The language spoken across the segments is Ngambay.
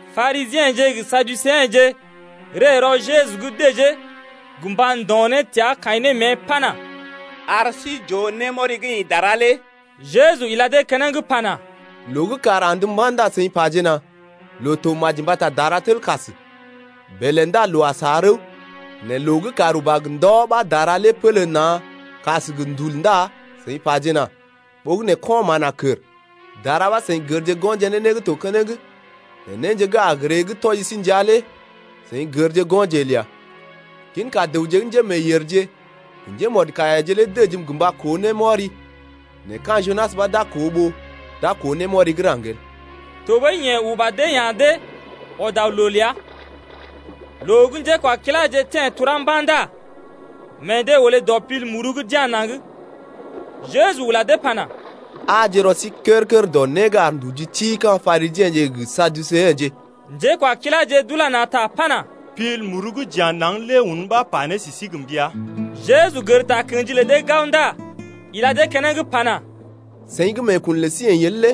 Parisiḛje gə Saduseḛje ree rɔ Jeju’g dəjee gə mba ndo̰ ne təa kaḭ ne mée pana: Ar sí j’ooje némɔri gə́ ḭ dara lé. Jeju ila dee keneŋ pana: Loo gə́ kàr andə mba̰ ndá seḭ pajena: Loo to maji mbata dara tel kas, bèlè ndá loo a sa rəw. Nɛ loo gə́ kàr uba gə ndɔ ɓa dara lé pélé na̰ kas gə ndul ndá seḭ pajena: Ɓogənè ko̰ mán a kər. Dara ɓa seḭ gərje go̰je ne né gə́ to keneŋ nɛ néje gə́ a gə ree gə́ tɔji sí ndəa lé seḭ gərje go̰je el ya. Ginka dəwje gə́ njémeeyèrje gə njémɔdkaiyaje lé dəjim gə mba koo némɔri nɛ ka̰ Junas ɓa d’a koo ɓó d’a koo némɔri gə́ raŋg el. Tɔɓəi yeḛ uba dee ya̰ dee, ɔd aw loo ləa. Loo gə́ njékwakiláje teḛ turá mba̰ ndá meḛ dee olé dɔ pil muru gə́ d’ya̰ naŋg lé. Jeju ula dee pana: Aaje rɔ sí kər-kər dɔ né gə́ ar nduji ti ka̰ Parisiḛje gə Saduseḛje lé. Njékwakiláje d’ula na̰ ta pana: Pil muru gə́ j’ya̰ naŋg lé un ɓa pa ne sə sí gə mbəa. Jeju gər takə̰ji lə dee gao ndá ila dee keneŋ pana: Seḭ gə́ meekun lə sí əḭ el lé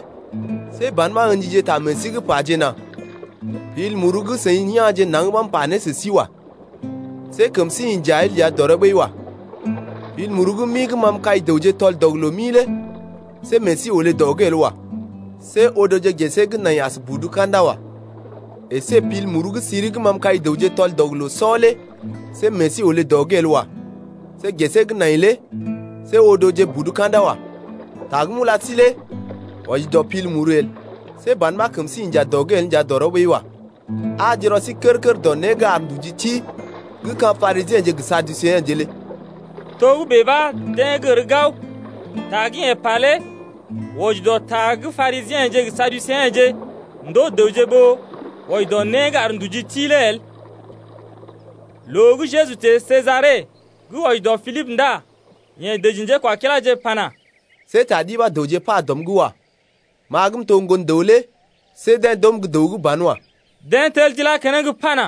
see ban ɓa ə̰jije ta meḛ sí’g pajena: Pil muru gə́ seḭ ya̰je naŋg ɓa m’pa ne sə sí wa. See kəm sí inja el nja dɔrɔ ɓəi wa. Pil muru gə́ mi gə́ ma m’kai dəwje tɔl-dɔg-loo-mi lé see meḛ sí olé dɔ’g el wa. See odoje gesee gə́ nai as budu ka̰da wa. Esé pil muru gə́ siri gə́ ma m’kai dəwje tɔl-dɔg-loo-sɔ lé see meḛ sí olé dɔ’g el wa. See gesee gə́ nai lé see odoje budu ka̰da wa. Ta gə́ m’ula sí lé wɔji dɔ pil muru el. See ban ɓa kəm sí inja dɔ’g el nja dɔrɔ ɓəi wa. Aaje rɔ sí kər-kər dɔ né gə́ ar nduji ti gə́ ka̰ Parisiḛje gə Saduseḛje lé. Togə́bè ɓa deḛ gər gao ta gə́ yeḛ pa lé wɔji dɔ ta gə́ Parisiḛje gə Saduseḛje ndoo dəwje ɓó wɔji dɔ né gə́ ar nduji ti lé el. Loo gə́ Jeju teḛ Sejare gə́ wɔji dɔ Pilibə ndá yeḛ dəji njékwakiláje pana: See ta ɗi ɓa dəwje pa dɔm’g wa. Ma gə m’to gə́ Ŋgon-dəw lé see deḛ d’oom gə́ dəw gə́ banwa. Deḛ tel d’ilá keneŋ pana: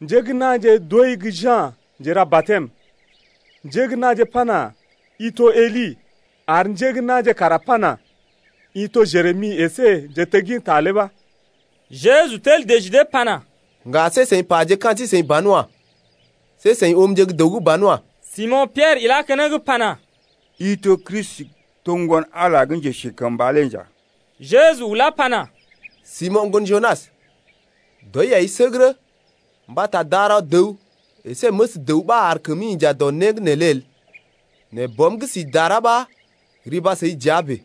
Njé gə́ na̰je d’ooi gə́ Ja̰ Njera-batɛm, njé gə́ na̰je pana: I to Eli, ar njé gə́ na̰je kara pana: I to Jeremi əsé njetegginta lé ɓa. Jeju tel dəji dee pana: Ŋga see seḭ paje ka̰ sí-seḭ banwa. See seḭ oomje gə́ dəw gə́ banwa. Simo̰ Piɛrə ilá keneŋ pana: I to Kristi gə́ to Ŋgon-Ala gə́ Njesikəmba lé nja. Jeju ulá pana: Simo̰, ŋgon Junas, dɔi ai səgərə, mbata darɔ dəw əsé məs dəw ɓa ar kəmi inja dɔ né gə́ neelé el nɛ Bɔm gə́ si dara ɓa riba səi dəa bèe.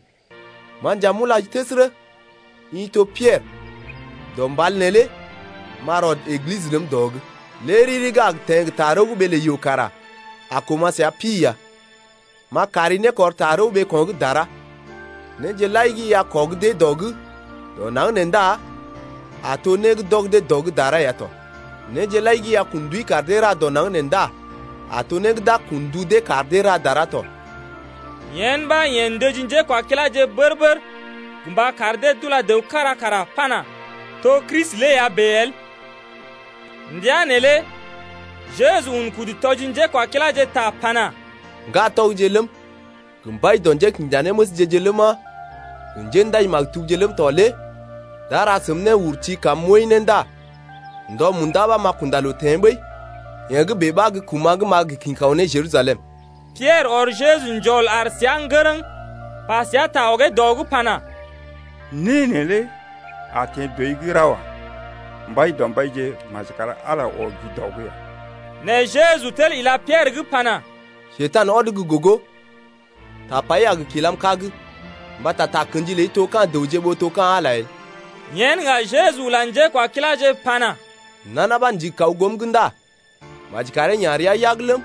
Ma nja m’ulai təsərə: I to Piɛrə, dɔ mbal neelé m’a rɔd Eglisə ləm dɔ’g. Lé riri gə́ a gə teḛ gə tarəw gə́ ɓee lə yoo kara a koma̰ səa pi ya. M’a kari nékɔr tarəw ɓeeko̰ gə́ dara. Néje lai gə́ i a kɔg dee dɔ’g dɔ naŋg nee ndá a to né gə́ d’ɔg dee dɔ’g dara ya tɔ. Néje lai gə́ i a kun ndui kar dee ra dɔ naŋg nee ndá a to né gə́ d’a kun ndu dee kar dee ra dara tɔ. Yen ɓa yeḛ ndəji njékwakiláje bər-bər gə mba kar dee d’ula dəw kára kara pana: To Kristi lé ya bèe el. Ndəa neelé Jeju un kudu tɔji njékwakiláje ta pana: Ŋgatɔgje ləm, gə mbai dɔ njékinjanéməsje-je ləma, gə njéndaji-maktubje ləm tɔ lé d’a ra sə neḛ néurti kar neḛ n’wəi ndá ndɔ munda ɓa n’a kunda loo teḛ ɓəi. Yee gə́ bèe ɓa gə́ kuma̰ gə́ n’a gə kḭ kaw ne Jerusalem ya. Piɛrə ɔr Jeju njɔl aar səa ŋgərəŋ pa səa ta ɔgee dɔ’g pana: Né neelé a teḛ dɔi’g ra wa. Mbaidɔmbaije, maji kar Ala lé ɔgi dɔ’g ya. Nɛ Jeju tel ila Piɛrə’g pana: Njekurai, ɔd gə́ gogo. Tapai a gə kilam kag, mbata takə̰ji ləi to ka̰ dəwje ɓó to ka̰ Ala el. Yen ŋga Jeju ula njékwakiláje pana: Nana ɓa gə́ ndigi kaw goom’g ndá maji karee ya̰ rəa yag ləm,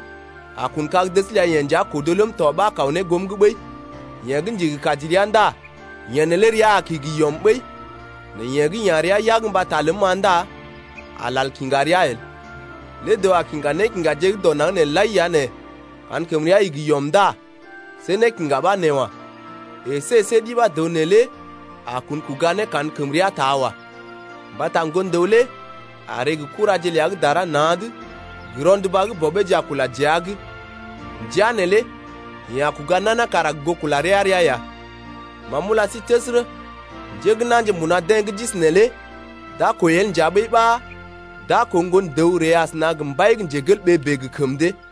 a kun kag-dəs ləa-yeḛ nja kodo ləm tɔ ɓa a kaw ne goom’g ɓəi. Yeḛ gə́ ndigi kaji rəa ndá yeḛ neelé rəa a kigi yɔm ɓəi nɛ yeḛ gə́ ya̰ rəa yag mbata ləm-ma ndá a lal kiŋga rəa el. Lé dəw a kiŋga nékiŋgaje gə́ dɔ naŋg nee lai ya nɛ kankəmrea igi yɔm ndá see nékiŋga ɓa nee wa. Esé see ɗi ɓa dəw neelé a kun kuga ne kankəmrea taa wa. Mbata Ŋgon-dəw lé a ree gə kuraje ləa gə́ dara na̰’d gə rɔnduba gə́ bɔbeeje a kula dəa’g. Ndəa neelé yeḛ a kuga nana kara gə goo kula rəa-rəa ya. Ma m’ula sí təsərə, njé gə́ na̰je mbuna deḛ gə́ d’isi neelé d’a kwəi el nja ɓəi ɓa d’a koo Ŋgon-dəw ree asəna gə mbai bèe gə kəm dee.